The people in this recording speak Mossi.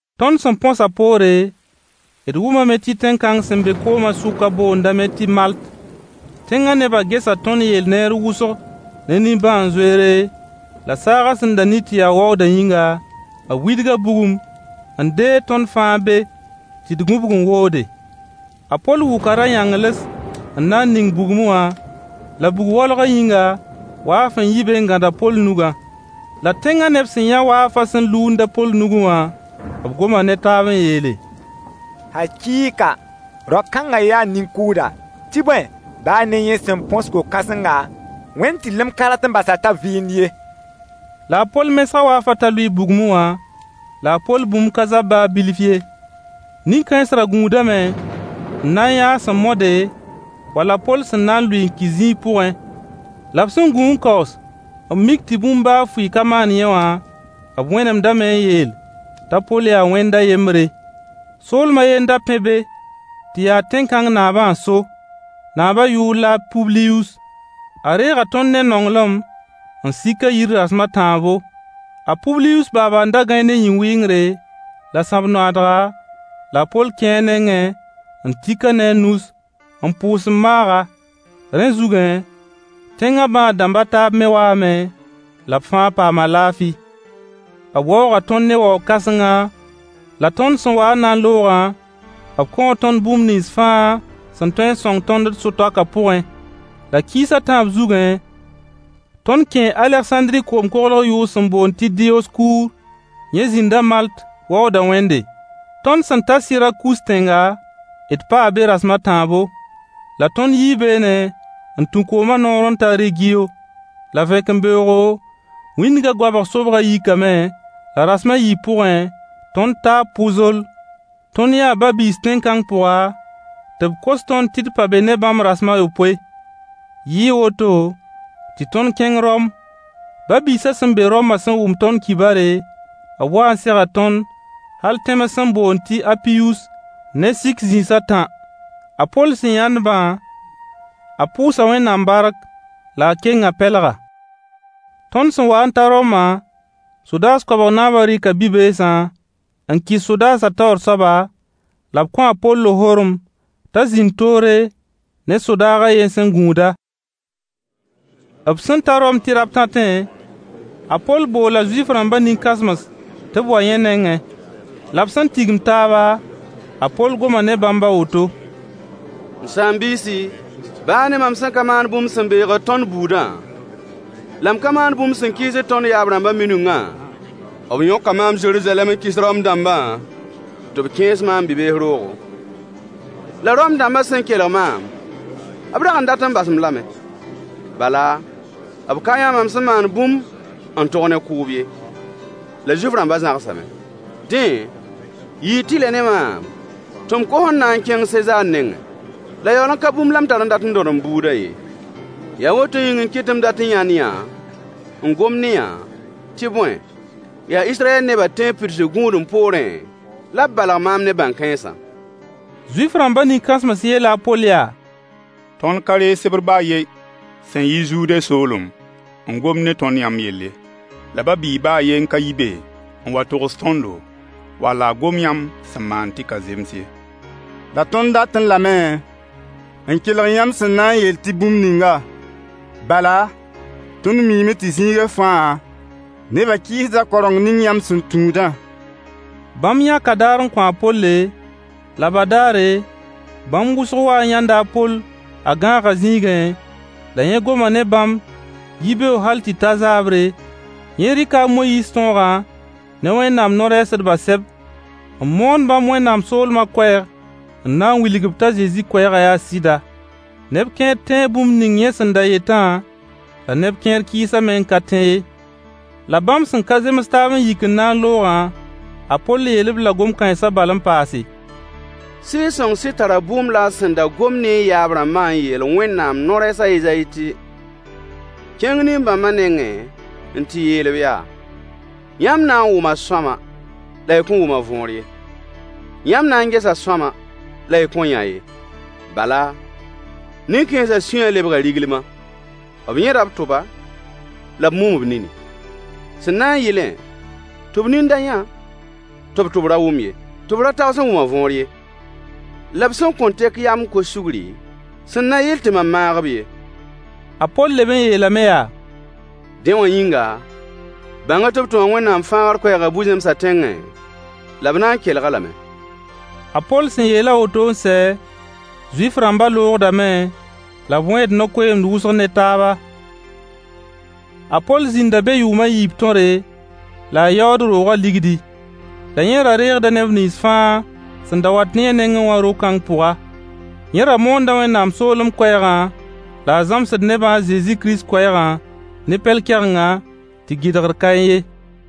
Tõnd sẽn põsã poore, d wʋmame tɩ tẽn-kãng sẽn be koomã sʋkã boondame tɩ Malt. Tẽngã neba gesa tõnd yell neer wʋsg ne nimbãan-zoeere la saagã sẽn da ni tɩ ya waoodã yĩnga, b widga bugum n deeg tõnd fãa be tɩ d gũbg n woode. A Poll wʋka ra-yãngls n na n ning bugmẽ wã, la bug-waolgã yĩnga, waaf n yi be n gãd a Poll nugã. La tẽngã neb sẽn yã waafa sẽn luund a Poll nugẽ wã, b goma ne taab n yeele: Hakɩɩka rao-kãnga yaa nin-kʋʋda, tɩ bõe, baa ne yẽ sẽn põs ko-kãsengã, wẽnd tɩrlem ka rat n bas-a t'a vɩɩnd ye. La a Poll mesga waafã t'a lʋɩ bugmẽ wã la a Poll bũmb ka zab baa bilf ye. Nin-kãens ra gũudame n na n yã a sẽn mode wall a Poll sẽn na n lʋɩ n ki zĩig pʋgẽ. La b sẽn gũ n kaoos n mik tɩ bũmb baa fʋɩ ka maan yẽ wã, b wẽnemdame n yeel t'a Poll yaa wẽnd a yembre. Soolem a ye n da pẽ be tɩ ya tẽn-kãng naabã n so, naabã yʋʋr la a Publius. A reega tõnd ne nonglem n sik a yir rasem a tãabo. A Publius baaba n da gãe ne yĩn-wɩngre la sãb-noaadga, la a Poll kẽe a nengẽ n tik-a ne a nus n pʋʋs n maag-a. Rẽ zugẽ, tẽngã bãad-dãmb a taab me waame, la b fãa paama laafɩ. B waooga tõnd ne waoog kãsenga, la tõnd sẽn wa n na n loogã, b kõo tõnd bũmb nins fãa sẽn tõe n sõng tõnd d so-toakã pʋgẽ. La kiis a tãab zugẽ, tõnd kẽe Alegsãndri koom-koglg yʋʋr sẽn boond tɩ Diyoskuur yẽ zĩnda Malt waooda wẽnde. Tõnd sẽn taa Sɩrakus tẽnga d paa be rasem a tãabo. La tõnd yii beene n tũ koomã noor n ta Regiyo. La vẽkembeoogo, wĩndga goabg sobgã yikame, la rasem a yiib pʋgẽ, tõnd taa Pʋzoll. Tõnd yãa ba-biis tẽn-kãng pʋga, tɩ b kos tõnd tɩ d pa be ne bãmb rasem a yopoe. Yɩɩ woto tɩ tõnd kẽng Rom. Ba-biisã sẽn be Roma sẽn wʋm tõnd kibare, b waa n sega tõnd hal tẽms sẽn boond tɩ Apiyus ne Sik-zĩis a tã. A Poll sẽn yãnd-bã, a pʋʋsa Wẽnnaam bark la a keng a pɛlga. Tõnd sẽn wa n ta Roma, sodaas koabg naabã rɩka bi-beesã n kɩs sodaasã taoor soaba, la b kõo a Poll lohorem t'a zĩnd toore ne sodaag a yen sẽn gũud-a. B sẽn ta Rom tɩ rabtãtẽ, a Poll boola Zuif-rãmba nin-kãsems tɩ b wa yẽ nengẽ. La b sẽn tigim taaba, a Poll goma ne bãmb a woto: M saam-biisi, baa ne mam sẽn ka maan bũmb sẽn beegd tõnd buudã, la m ka maan bũmb sẽn kɩɩsd tõnd yaab-rãmbã minungã, b yõka maam Zeruzalɛm n kɩs Rom-dãmba tɩ b kẽes maam bi-bees roogo. La Rom-dãmba sẽn kelg maam, b rag n dat n bas-m lame, bala b ka yã mam sẽn maan bũmb n tog ne kʋʋb ye. La Zuif-rãmba zãgsame, dẽ, yɩɩ tɩlɛ ne maam tɩ m kos n na n kẽng Sezaar nengẽ. La yaool n ka bũmb la m tar n dat n dõd m buudã ye. Yaa woto yĩng n kɩt tɩ m dat n yãnd-yã n gom ne-yã, tɩ bõe, yaa Israyɛl neba tẽeb pidsg gũudem poorẽ la b balg maam ne bãn-kãensã. Zuif-rãmba nin-kãsems yeela a Poll yaa: Tõnd ka reeg sebr baa a yen sẽn yi Zude soolem n gomd ne tõnd yãmb yell ye, la ba-biig baa a yen ka yi be n wa n togs tõndo, wall a gom yãmb sẽn maan tɩ ka zems ye. La tõnd datẽ lame n kelg yãmb sẽn na n yeel tɩ bũmb ninga, bala tõnd miime tɩ zĩiga fãa, neba kɩɩsda kaoreng ning yãmb sẽn tũudã. Bãmb yãka daar n kõ a Polle, la badaare bãmb wʋsg waa n yãnd a Poll a gãagã zĩigẽ, la yẽ goma ne bãmb yibeoog hal tɩ ta zaabre, yẽ rɩka a Moyiis tõogã ne Wẽnnaam no-rɛɛsdba sɛb n moon bãmb Wẽnnaam soolmã koɛɛg n na n wilg-b t'a Zezi koɛɛgã yaa sɩda. Neb kẽer tẽe bũmb ning yẽ sẽn da yetã la neb kẽer kɩɩsame n ka tẽ ye. La bãmb sẽn ka zems taab n yik n na n loogã, a Poll yeel-b-la gom kãensã bal n paase: Sɩɩg-sõng sɩd tar bʋʋm la a sẽn da gom ne y yaab-rãmbã n yeel Wẽnnaam no-rɛɛs a Ezayi tɩ: “Kẽng nin-bãmbã nengẽ n tɩ yeel-b yaa: Yãmb na n wʋma sõama la y kõn wʋm a võor ye. Yãmb na n gesa sõama la y kõn yã ye. Bala, nin-kãensã sũyã lebga riglima, b yẽda b tʋba, la b mum b nini, sẽn na yɩlẽ tɩ b nin da yã, tɩ b tʋb ra wʋm ye, tɩ b ra tags n wʋm a võor ye. La b sẽn kõn tek yam n kos sugri, sẽn na yɩl tɩ mam maag-b ye.” A Poll leb n yeelame yaa: Dẽ wã yĩnga, bãng-y tɩ b tʋma Wẽnnaam fãagr koɛɛga bu-zẽmsã tẽngẽ, la b na n kelg-a lame. [ A Poll sẽn yeel a woto n sɛ, Zuif-rãmba loogdame la b wẽed no-koeemd wʋsg ne taaba.] A Poll zĩnda be yʋʋm a yiib tõre, la a yaood roogã ligdi. La yẽ ra reegda neb nins fãa sẽn da wat yẽ nengẽ wã ro-kãng pʋga. Yẽ ra moonda Wẽnnaam soolem koɛɛgã, la a zãmsd nebã a Zezi Kirist koɛɛgã ne pɛl-kɛgenga, tɩ gɩdgr kaẽ ye.